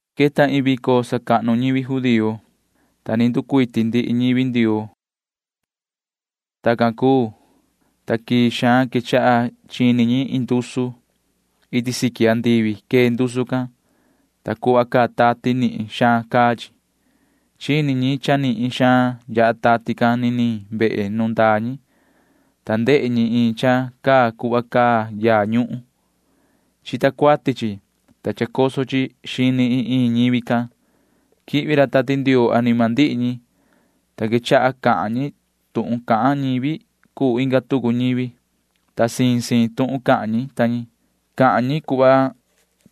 Queta iin vico sacahnu ñivi judío, ta ni nducuiti ndihi ñivi Ndioo. Tacan cuu, ta quii xaan quechaha chini ñi iin ndusu. Iti siqui andivi quee ndusu can, ta cuhva caa tati nihin xaan caa chi. Chini ñi cha nihin xaan yaha tati can niniin vehe nu ndaa ñi, ta ndehe ñi iin cha caa cuhva caa yaa ñuhun. Chita cuati chi, ta chacoso chi xini iin iin ñivi can. Quihvi ra Tati Ndioo anima ndihi ñi, ta quechaha cahan ñi tuhun cahan ñivi cuu inga tucu ñivi, ta siin siin tuhun cahan ñi ta ñi. Cahan ñi cuhva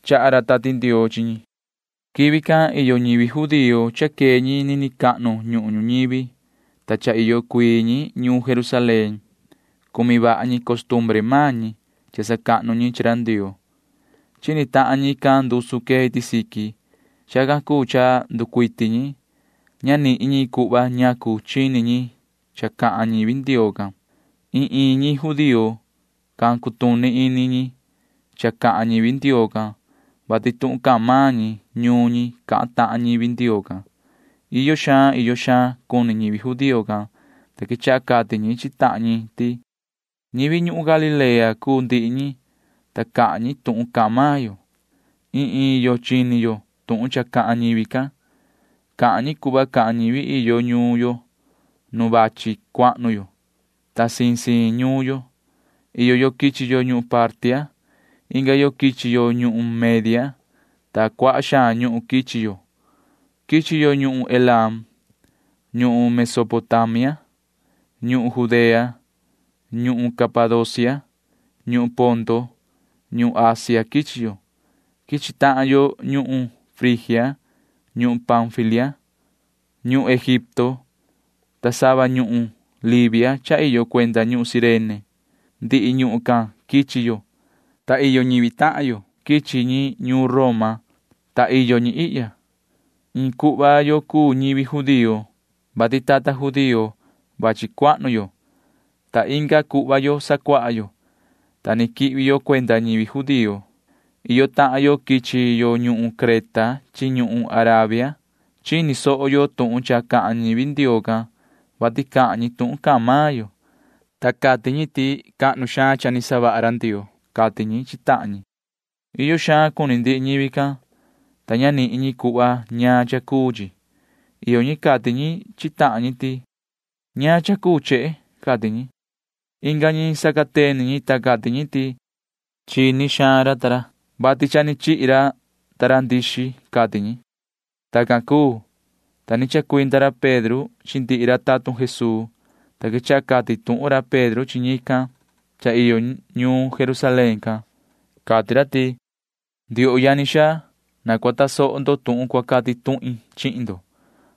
chaha ra Tati Ndioo chi ñi. Quivi can iyo ñivi judío cha quee ñi nini cahnu ñuhun ñuñivi, ta cha iyo cuii ñi ñuun Jerusalén. Cumi vaha ñi costumbre maan ñi cha sacahnu ñi chi ra Ndioo. Chini tahan ñican ndusu quee iti siqui. Chacan cuu cha nducuiti ñi. Ña nihin ñi cuhva ñacu chini ñi cha cahan ñivi Ndioo can. Iin iin ñi judío can cutuni ini ñi cha cahan ñivi Ndioo can, vati tuhun cahan maan ñi ñuun ñi cahan tahan ñivi Ndioo can. Iyo xaan iyo xaan cuni ñivi judío can, ta quechaha cati ñi chi tahan ñi ti: ―Ñivi ñuhun Galilea cuu ndihi ñi, ta cahan ñi tuhun cahan maan yo. Iin iin yo chini yo tuhun cha cahan ñivi can. Cahan ñi cuhva cahan ñivi iyo ñuun yo nu vachi cuahnu yo, ta siin siin ñuun yo. Iyo yo quichi yo ñuhun Partia. Inga yo quichi yo ñuhun Media, ta cuaha xaan ñuhun quichi yo. Quichi yo ñuhun Elam, ñuhun Mesopotamia, ñuhun Judea, ñuhun Capadocia, ñuhun Ponto, ñuhun Asia quichi yo. Quichi tahan yo ñuhun Frigia, ñuhun Panfilia, ñuhun Egipto, ta sava ñuhun Libia cha iyo cuenda ñuhun Cirene. Ndihi ñuhun can quichi yo, ta iyo ñivi tahan yo quichi ñi ñuun Roma, ta iyo ñi ihya. Iin cuhva yo cuu ñivi judío, vati tata judío vachi cuahnu yo, ta inga cuhva yo sacuaha yo, ta ni quihvi yo cuenda ñivi judío. Iyo tahan yo quichi yo ñuhun Creta chi ñuhun Arabia. Chini soho yo tuhun cha cahan ñivi Ndioo can, vati cahan ñi tuhun cahan maan yo, ta cati ñi ti cahnu xaan cha ni savaha ra Ndioo ―cati ñi chi tahan ñi. Iyo xaan cuni ndihi ñivi can, ta ña nihin ñi cuhva ñaan cha cuu chi. Iyo ñi cati ñi chi tahan ñi ti: ―¿Ñaan cha cuu chehe? ―cati ñi. Inga ñi sacateni ñi, ta cati ñi ti: ―Chini xaan ra, vati cha chihi ra ndixi ―cati ñi. Tacan cuu, ta ni chacuinda ra Pedro chi ndihi ra tatun Jesuu, ta quechaha cati tuhun ra Pedro chi ñican cha iyo ñuun Jerusalén can. Cati ra ti: ―Ndioho yani xaa, na cua tasoho ndo tuhun cua cati tuhin chihin ndo,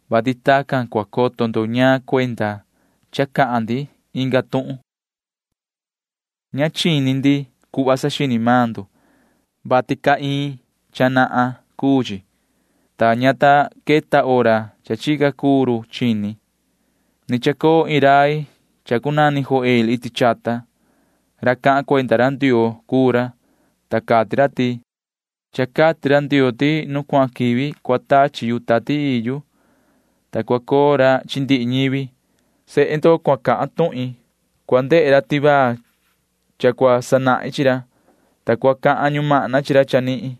vati tacan cua coto ndo ñaan cuenda cha cahan ndi inga tuhun. Ña chini ndi cuhva saxini maan ndo, vati caa iin cha nahan cuu chi, ta [ña ta queta hora cha chica cuu ra chini]. Ni chacoo iin rai cha cunani Joel iti chata. Ra cahan cuenda ra Ndioo cuu ra, ta cati ra ti: Cha cati ra Ndioo ti: nu cuahan quivi cua tachi yu Tati Ii yu, ta cua coo ra chi ndihi ñivi. Sehe ndo cua cahan tuhin. Cua ndehe ra tivaa cha cua sanahin chi ra, ta cua cahan ñumahna chi ra chanihin.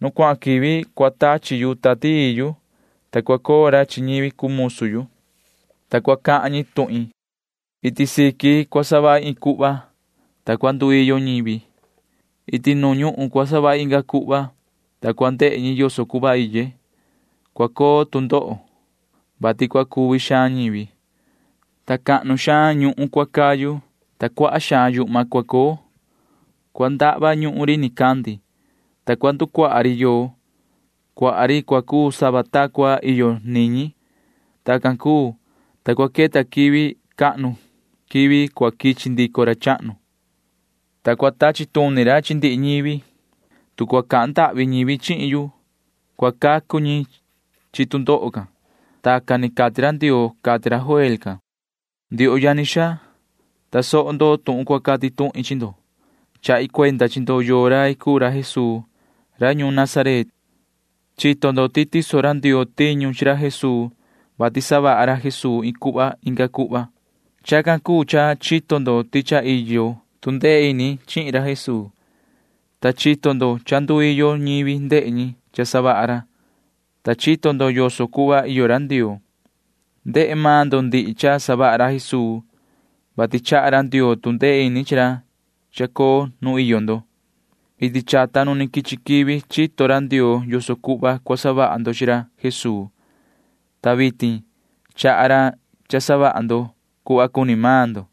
Nu cuahan quivi cua tachi yu Tati Ii yu, ta cua coo ra chi ñivi cuu musu yu, ta cua cahan ñi tuhin. Iti siqui cua savahi iin cuhva, ta cua nduiyo ñivi. Iti nu ñuhun cua savahi inga cuhva, ta cua ndehe ñi yoso cuhva iye. Cua coo tu ndoho, vati cua cuvi xaan ñivi, ta cahnu xaan ñuhun cua cayu, ta cuaha xaan yuhma cua coo. Cua ndahva ñuhun ri nicandi, ta cua nducuaha ri yoo. Cuaha ri cua cuu sava ta cua iyo niñi. Tacan cuu, ta cua queta quivi cahnu quivi cua quichi ndico ra chahnu, ta cua tachi tuni ra chi ndihi ñivi. Tu cua cahan ndahvi ñivi chihin yu, cua cacu ñi chi tu ndoho can. Tacan ni cati ra Ndioo ―cati ra Joel can. ’Ndioho yani xaa, tasoho ndo tuhun cua cati tuhin chi ndo. Chahi cuenda chi ndo yoo rai cuu ra Jesuu ra ñuun Nazaret. Chito ndo ti tiso ra Ndioo tiñu chi ra Jesuu, vati savaha ra Jesuu iin cuhva inga cuhva. Chacan cuu cha chito ndo ti cha iyo tu ndee ini chihin ra Jesuu, ta chito ndo cha nduiyo ñivi ndehe ñi cha savaha ra, ta chito ndo yoso cuhva iyo ra Ndioo. Ndehe maan ndo ndihi cha savaha ra Jesuu, vati chaha ra Ndioo tu ndee ini chi ra chacoo nu iyo ndo. Iti chata nu quichi quivi chito ra Ndioo yoso cuhva cua savaha ndo chi ra Jesuu, ta vitin chaha ra cha savaha ndo cuhva cuni maan ndo.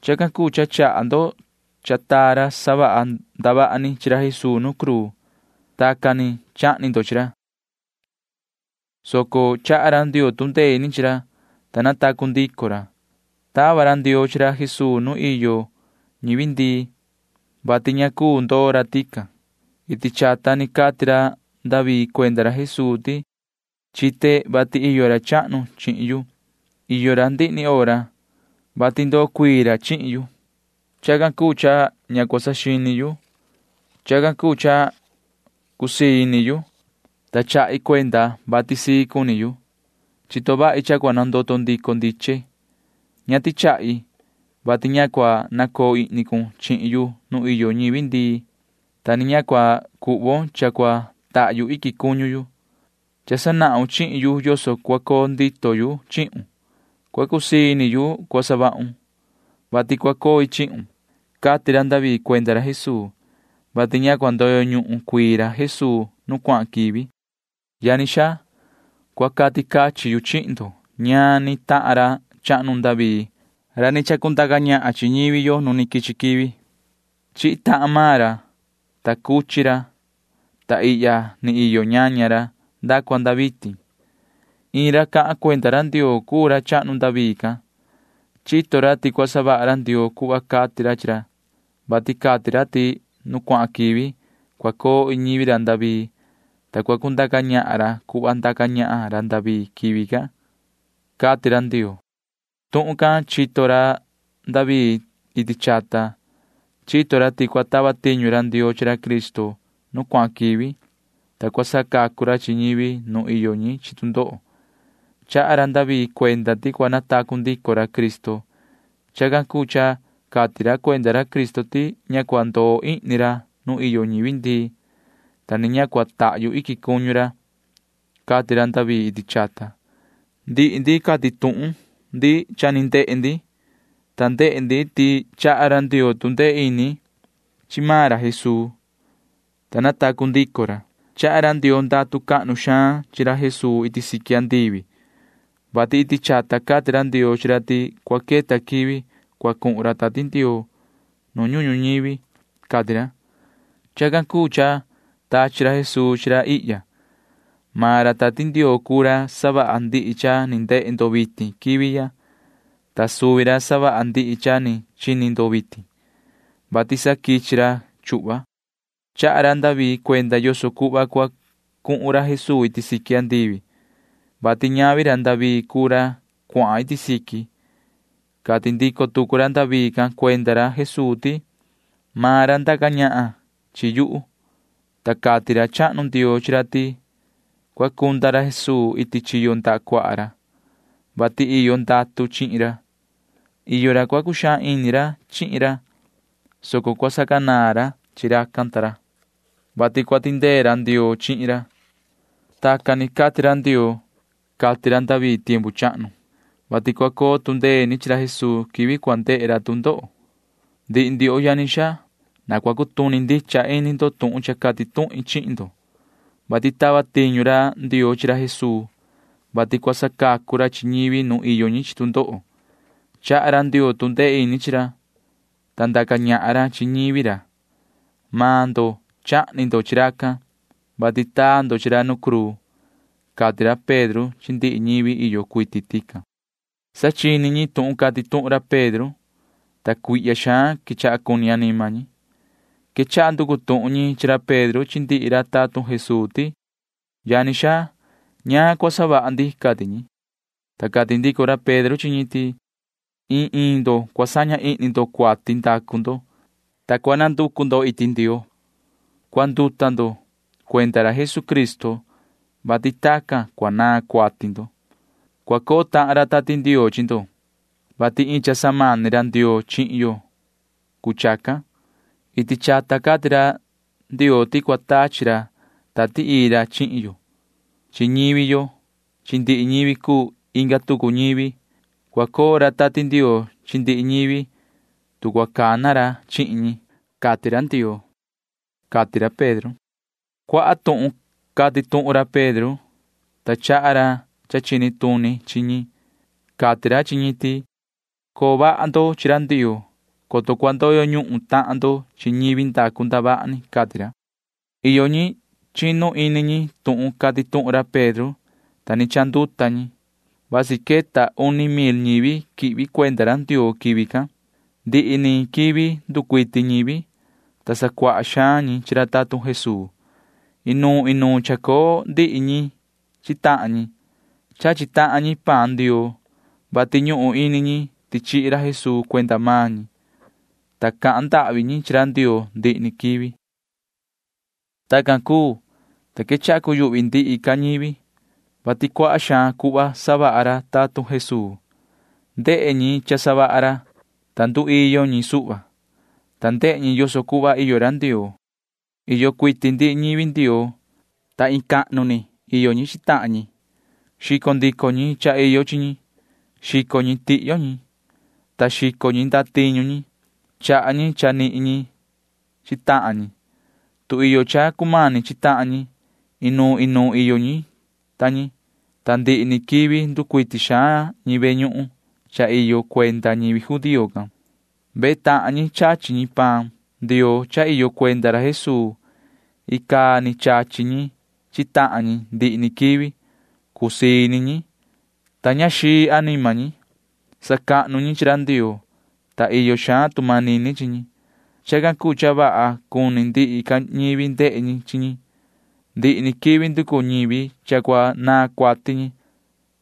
Chacan cuu cha chaha ndo cha taa ra savaha ndavaha ni chi ra Jesuu nu cruu. Tacan ni chahni ndo chi ra, soco chaha ra Ndioo tu ndee ini chi ra, ta natacu ndico ra. Tava ra Ndioo chi ra Jesuu nu iyo ñivi ndii, vati ña cuu ndoo ra tican. Iti chata ni cati ra David cuenda ra Jesuu ti: Chite vati iyo ra chahnu chihin yu. Iyo ra ndihi ni hora, vati ndoo cuii ra chihin yu. Chacan cuu cha ña cua saxini yu. Chacan cuu cha cusii ini yu, ta chahi cuenda vati sii cuni yu. Chito vahi cha cua nandoto ndico ndiche. Ña tichahi, vati ña cua nacoo ihni cun chihin yu nuun iyo ñivi ndii, ta ni ña cua cuhvon cha cua tahyu iquin cuñu yu. Cha sanahun chihin yu yoso cua coo ndito yu chihun. Cua cusii ini yu cua savahun, vati cua coi chihun, cati ra David cuenda ra Jesuu, [vati ña cua ndoyo ñuhun cuii ra Jesuu nu cuahan quivi]. ’Yani xaa, cua cati cachin yu chihin ndo ñaan ni tahan ra chahnu David ra ndaca ñahan chi ñivi yo nu ni quichi quivi. Chihi tahan maan ra, ta cuchi ra, ta ihya ni iyo ñaña ra nda cua nda vitin. Iin ra cahan cuenda ra Ndioo cuu ra chahnu David can. Chito ra ti cua savaha ra Ndioo cuhva cati ra chi ra, vati cati ra ti nu cuahan quivi cua coo iin ñivi ra David, ta cua cundaca ñahan ra cuhva ndaca ñahan ra David quivi can, cati ra Ndioo. Tuhun can chito ra David iti chata. Chito ra ti cua tava tiñu ra Ndioo chi ra Cristo nu cuahan quivi, ta cua sacacu ra chi ñivi nu iyo ñi chi tu ndoho. Chaha ra David cuenda ti cua natacu ndico ra Cristo. Chacan cuu cha cati ra cuenda ra Cristo ti ña cua ndoo ihni ra nu iyo ñivi ndii, ta ni ña cua tahyu iquin cuñu ra, cati ra David iti chata. Ndihi ndi cati tuhun ndi cha ni ndehe ndi, ta ndehe ndi ti chaha ra Ndioo tu ndee ini chi maan ra Jesuu, ta natacu ndico ra. Chaha ra Ndioo ndatu cahnu xaan chi Jesuu iti siqui andivi, vati iti chata cati ra Ndioo chi ra ti cua queta quivi cua cuhun ra Tati Ndioo nu ñuhun ñuñivi, cati ra. Chacan cuu cha tachi ra Jesuu chi ra ihya. Maan ra Tati Ndioo cuu ra savaha ndihi cha ni ndehe ndo vitin quivi ya, ta suvi ra savaha ndihi cha ni chini ndo vitin, vati sa quichi ra chuhva. Chaha ra David cuenda yoso cuhva cua cuhun ra Jesuu iti siqui, vati ñavi ra David cuu ra cuahan iti siqui. Cati ndico tucu ra David can cuenda ra Jesuu ti: Maan ra ndaca ñahan chi yuhu, ta cati ra chahnu Ndioo chi ra ti cua cunda ra Jesuu iti chiyo ndaha cuaha ra, vati iyo ndatu chihin ra. Iyo ra cua cuxaan ini ra chihin ra, soco cua sacanaan ra chi racan ta ra, vati cua tindee ra Ndioo chihin ra. Tacan ni cati ra Ndioo, cati ra David tiempu chahnu, [vati cua coo tu ndee ini chi ra Jesuu quivi cua ndehe ra tu ndoho]. ’Ndihi ndioho yani xaa, na cua cutuni ndicha ini ndo tuhun cha cati tuhin chihin ndo, vati tava tiñu ra Ndioo chi ra Jesuu, vati cua sacacu ra chi ñivi nu iyo ñi chi tu ndoho. Chaha ra Ndioo tu ndee ini chi ra, ta ndaca ñahan ra chi ñivi ra. Maan ndo chahni ndo chi racan, vati taa ndo chi ra nu cruu ―cati ra Pedro chi ndihi ñivi iyo cuiti tican. Sa chini ñi tuhun cati tuhun ra Pedro, ta cuihya xaan quechaha cuni anima ñi. Quechaha nducu tuhun ñi chi ra Pedro chi ndihi ra tatun Jesuu ti: ―Yani xaa, ¿ñaan cua savaha ndi? ―cati ñi. Ta cati ndico ra Pedro chi ñi ti: ―Iin iin ndo cua saña ihni ndo cuati ndacu ndo, ta cua nducu ndo iti Ndioo. Cuanduta ndo cuenda ra Jesucristo, vati cua naan cuati ndo. Cua coo tahan ra Tati Ndioo chi ndo, vati iin cha samani Ndioo chihin ndo cuu chacan. Iti chata cati ra Ndioo ti cua tachi ra Tati Ii ra chihin ndo chi ñivi ndo chi ndihi ñivi cuu inga tucu ñivi. Cua coo ra Tati Ndioo chi ndihi ñivi, tu cua cana ra chihin ñi, cati ra Ndioo ―cati ra Pedro. Cuaha tuhun cati tuhun ra Pedro, ta chaha ra cha chini tuni chi ñi. Cati ra chi ñi ti: ―Coo vaha ndo chi ra Ndioo, coto cua ndoyo ñuhun tahan ndo chi ñivi ndacu ndavaha ni ―cati ra. Iyo ñi chinu ini ñi tuhun cati tuhun ra Pedro, ta ni chanduta ñi. Vasi queta uni mil ñivi quihvi cuenda ra Ndioo quivi can. Ndihi ni quivi nducuiti ñivi, ta sacuaha xaan ñi chi ra tatun Jesuu. Inuun inuun chacoo ndihi ñi chi tahan ñi. Chachi tahan ñi paan Ndioo, vati ñuhun ini ñi ti chihi ra Jesuu cuenda maan ñi, ta cahan ndahvi ñi chi ra Ndioo ndihi ni quivi. Tacan cuu, ta quechaha cuyuhvi ndihi ca ñivi, vati cuaha xaan cuhva savaha ra tatun Jesuu. Ndehe ñi cha savaha ra, ta nduiyo ñi suhva, ta ndehe ñi yoso cuhva iyo ra Ndioo. Iyo cuiti ndihi ñivi Ndioo, ta iin cahnu iyo ñi chi tahan ñi. Xico ndico ñi cha iyo chi ñi. Xico ñi tihyo ñi, ta xico ñi ndatiñu ñi, ta chaha ñi cha ni nihin ñi chi tahan ñi, tu iyo cha cumani chi tahan ñi. Inuun inuun iyo ñi ta ñi, ta ndihi ni quivi nducuiti xaan ñi ve ñuhun cahnu cha iyo cuenda ñivi judío can. Vehe tahan ñi chachi ñi paan Ndioo cha iyo cuenda ra Jesuu. Icaa ni chachi ñi chi tahan ñi ndihi ni quivi. Cusii ini ñi, ta ña xii anima ñi. Sacahnu ñi chi ra Ndioo, ta iyo xaan tu manini chi ñi. Chacan cuu cha vaha cuni ndihi ca ñivi ndehe ñi chi ñi. Ndihi ni quivi nducu ñivi cha cua naan cuati ñi,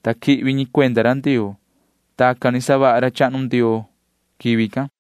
ta quihvi ñi cuenda ra Ndioo. Tacan ni savaha ra chahnu Ndioo quivi can.